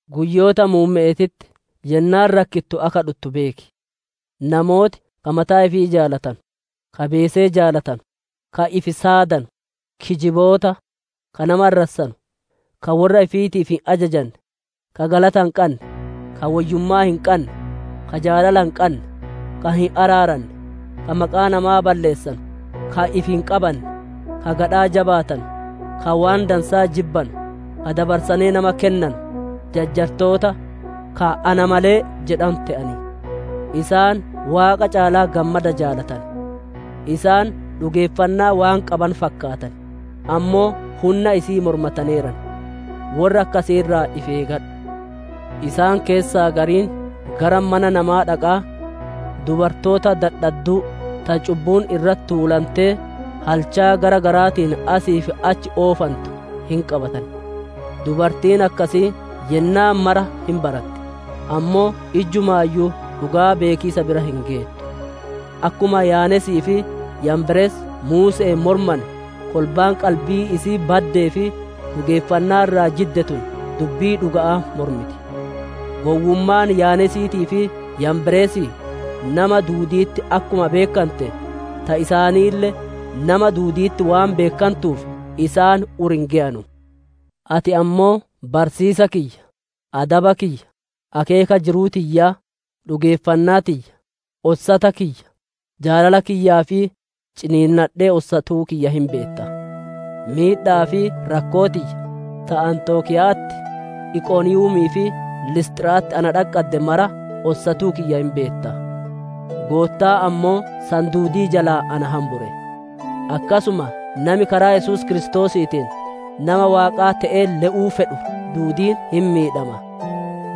Guyyoota muumme'eetitti yennaan rakkittu akka dhuttu beeki. Namooti ka mataa ifii jaalatanu, ka beesee jaalatanu, ka ifi saadanu, kijiboota, ka nama arrassanu, ka worra ifiitiif hin ajajanne, ka galata hin qanne, ka woyyummaa hin qanne, ka jaalala hin qanne, ka hin araaranne, ka maqaa namaa balleessanu, ka ifi hin qabanne, ka gadhaa jabaatanu, ka waan dansaa jibbanu, ka dabarsanee nama kennanu, jajjartoota, ka ana malee jedhanu te'an; isaan Waaqa caalaa gammada jaalatan; isaan dhugeeffannaa waan qabanu fakkaatan, ammoo hunna isi'ii mormataneeran. Worra akkasii irraa ifi eegadhu. Isaan keessaa gariin gara mana namaa dhaqaa, dubartoota dadhadduu ta cubbuun irratti tuulantee, halchaa gara garaatiin asii fi achi oofantu, hin qabatan. Dubartiin akkasii yennaa mara hin baratti, ammoo ijjumaayyuu dhugaa beekiisa bira hin geettu. Akkuma Yaaneesii fi Yaamberes Muuse'een mormane, kolbaan qalbii isi'ii baddee fi dhugeeffannaa irraa jidde tun dubbii dhuga'aa mormiti. Gowwummaan Yaaneesiitii fi Yaamberesii, nama duudi'itti akkuma beekkante, ta isaaniille nama duudi'itti waan beekkantuuf isaan ur hin geyanu. Ati ammoo barsiisa kiyya, adaba kiyya, akeeka jiruu tiyyaa, dhugeeffannaa tiyya, ossata kiyya, jaalala kiyya, fi ciniinnadhee ossatuu kiyya hin beetta. Miidha'aa fi rakkoo tiyya, ta Anxokiya'atti, Iqoniiyumii fi Lisxira'atti na dhaqqadde mara ossatuu kiyya hin beetta. Goottaan ammoo san duudii jalaa na hambure. Akkasuma nami karaa Yesuus Kiristoosiitiin nama Waaqaa te'ee le'uu fedhu duudiin hin miidhama.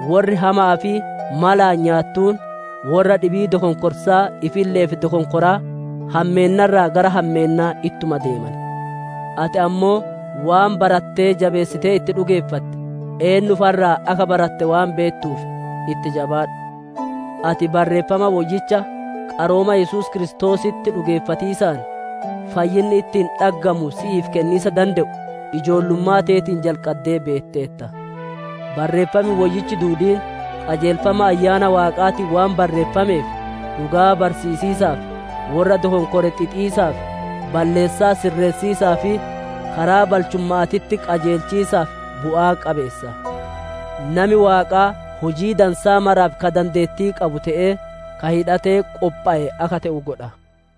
Worri hama'aa fi malaan nyaattuun worra dhibii dokonkorsaa ifille'eef dokonkoraa, hammeenna irraa gara hammeennaa ittuma deeman. Ati ammoo waan barattee jabeessitee itti dhugeeffatte, eennuu fa'a irraa akka baratte waan beettuuf itti jabaadhu. Ati Barreeffama Woyyicha, qarooma Yesuus Kiristoositti dhugeeffatiisaan fayyinni ittiin dhaggamu si'iif kenniisa dande'u ijoollummaa teetiin jalqaddee beetteerta. Barreeffam Woyyichi duudiin qajeelfama Ayyaana Waaqaatiin waan barreeffameef, dhugaa barsiisiisaaf, worra dokonkore xixiisaaf, balleessaa sirreessiisaa fi karaa balchumma'aatitti qajeelchiisaaf bu'aa qabeessa. Nami Waaqaa hujii dansaa maraaf ka dandeettii qabu te'ee, ka hidhatee qophowe akka te'u godha.